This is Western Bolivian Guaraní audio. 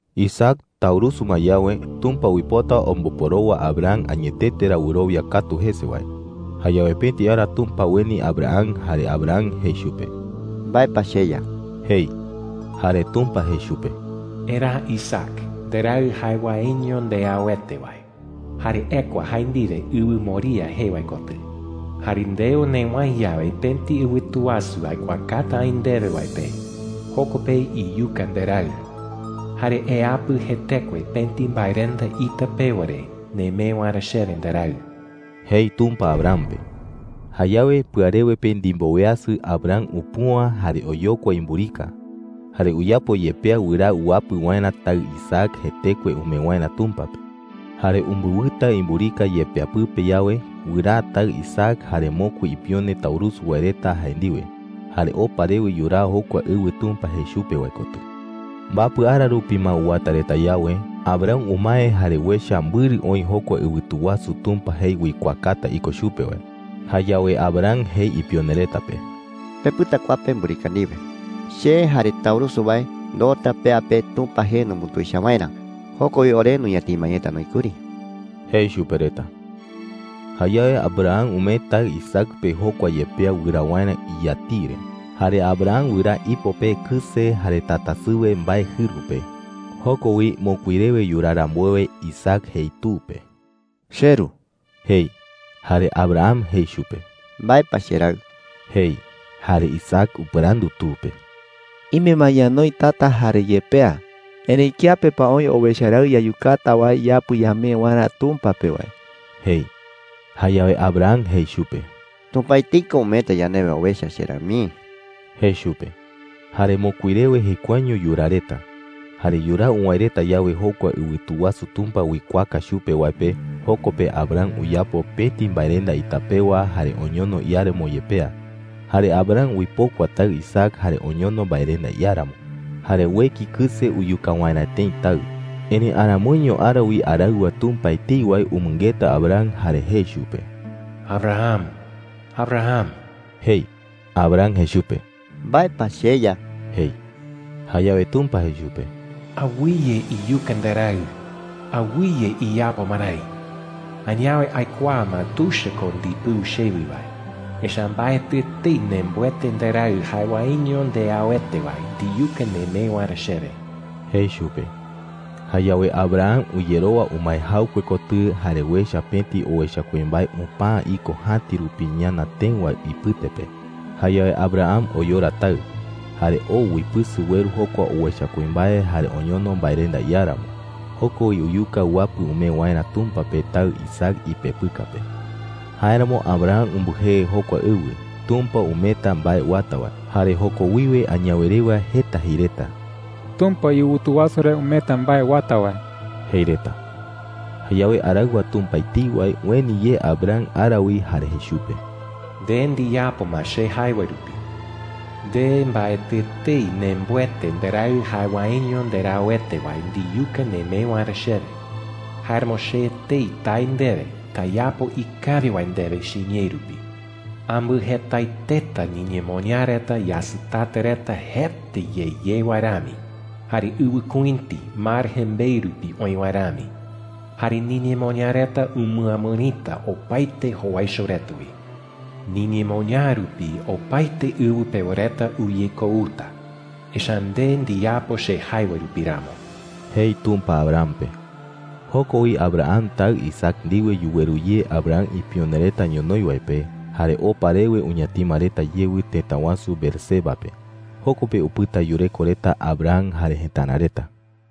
Isaac taurusu ma yawe, Tumpa uipota omboporowa Abraham añetete ra wɨrowia katu jese wae. Jayawe pëti ara Tumpa ueni Abraham. Jare Abraham jei chupe: “¿Mbae pa, cheYa?” jei. Jare Tumpa jei chupe: “Eraa Isaac, nderaɨ jae waeño ndeauete wae, jare ekua jae ndiwe ɨwɨ Moriah Ɨwɨ Moriah oï wi ɨwɨ Canaán pe etei. jee wae kotɨ,” jei. “Jare ndeo newäe yawe pëti ɨwɨtu wasu aikuaakata aï ndewe wae pe, joko pe iyuka nderaɨ. Jare eapɨ jetekue pëti mbaerenda ita pewa re nemee waerä chewe nderaɨ,” jei Tumpa Abraham pe. Jayawe pɨarewe pe ndimboweasɨ, Abraham upüa jare oyokua imburika. Jare uyapo yepea wɨraa uapɨ waerä taɨ Isaac jetekue umee waerä Tumpa pe. Jare umbɨwɨta imburika yepea pɨpe yawe, wɨraa taɨ Isaac jare mokui ipione taurusu wae reta jae ndiwe, jare opa rewe yuraa jokua ɨwɨ Tumpa jei chupe wae kotɨ. Mbapɨ ara rupi ma uwata reta yawe, Abraham umae jare uecha mbɨrɨ oï jokua ɨwɨtu wasu Tumpa jei uikuaakata iko chupe wae. Jayawe Abraham jei ipione reta pe: “Pepɨta kua pe mburika ndiwe. Che jare taurusu wae ndoota pea pe Tumpa jee numbutuicha waerä. Joko wi ore nuñatima yeta noï kuri,” jei chupe reta. Jayawe Abraham umee taɨ Isaac pe jokua yepea wɨraa waerä iyatiɨ re. Jare Abraham wɨraa ipo pe kɨse jare tatasɨwe mbae jɨru pe. Joko wi, mokui rewe yuraa rambuewe, Isaac jei tu pe: “Cheru,” jei. Jare Abraham jei chupe: “¿Mbae pa, cheraɨ?” jei. Jare Isaac upɨrandu tu pe: “Ime ma ñanoi tata jare yepea, erëi ¿kiape pa oï owecha raɨ yayukata wae yapɨ ñamee waerä Tumpa pe wae?” jei. Jayawe Abraham jei chupe: “Tumpa etei ko umeeta yandewe owecha, cheraɨ mii,” jei chupe. Jare mokui rewe jekuaeño yuraa reta. Jare yuraa uwäe reta yawe jokua ɨwɨtu wasu Tumpa uikuaaka chupe wae pe, joko pe Abraham uyapo pëti mbaerenda ita pewa jare oñono iáramo yepea. Jare Abraham uipokua taɨ Isaac jare oñono mbaerenda iáramo. Jare ueki kɨse uyuka waerä tëi taɨ. Erëi aramoiño ara wi araɨwa Tumpa etei wae umɨngeta Abraham jare jei chupe: “¡Abraham, Abraham!” jei. Abraham jei chupe: “¿Mbae pa, cheYa?” jei. Jayawe Tumpa jei chupe: “¡Awɨye iyuka nderaɨ! Awɨye iyapo marái. Añawe aikuaa ma tuicha ko ndipɨu chewi wae, echa’ä mbaetɨ etei nembɨete nderaɨ jae waeño ndeauete wae ndiyuka nemee waerä chewe,” jei chupe. Jayawe Abraham uyerowa umae jaɨkue kotɨ jare uecha pëti owecha kuimbae upäa iko jäti rupi ñana tëɨ wae ipɨte pe. Jayawe Abraham oyora taɨ. Jare oo uipɨsɨ ueru jokua owecha kuimbae jare oñono mbaerenda iáramo. Joko wi uyuka uapɨ umee waerä Tumpa pe taɨ Isaac ipepɨka pe. Jáeramo Abraham umbɨjee jokua ɨwɨ, “Tumpa umeeta mbae uata wae.” Jare joko wiwe añawe rewa jeta jei reta: “Tumpa iɨwɨtu wasu re umeeta mbae uata wae,” jei reta. Jayawe araɨwa Tumpa etei wae ueni ye Abraham ara wi jare jei chupe: “Nde ndiyapo ma che jae wae rupi,” jei chupe. “Nde mbaetɨ etei nembɨete nderaɨ jae waeño ndeauete wae ndiyuka nemee waerä chewe. Jáeramo che etei tae ndewe, tayapo ikawi wae ndewe chiñee rupi,” jei. “Ambɨjetaeteta niñemoñaa reta yasɨtata reta jeta ye ye wae rami, jare ɨwɨkuïti mar jembeɨ rupi oï wae rami. Jare niñemoñaa reta umɨamɨrita opaete jowaicho reta wi,” jei. “Niñemoñaa rupi opaete ɨwɨ pewa reta uyekouta, echa’ä nde ndiyapo che jae wae rupi ramo,” jei Tumpa Abraham pe. Joko wi Abraham taɨ Isaac ndiwe yuweru ye Abraham ipione reta ñonoï wae pe, jare opa rewe uñatima reta yewɨ tëta wasu Beerseba pe. Joko pe upɨta yureko reta Abraham jare jëtara reta.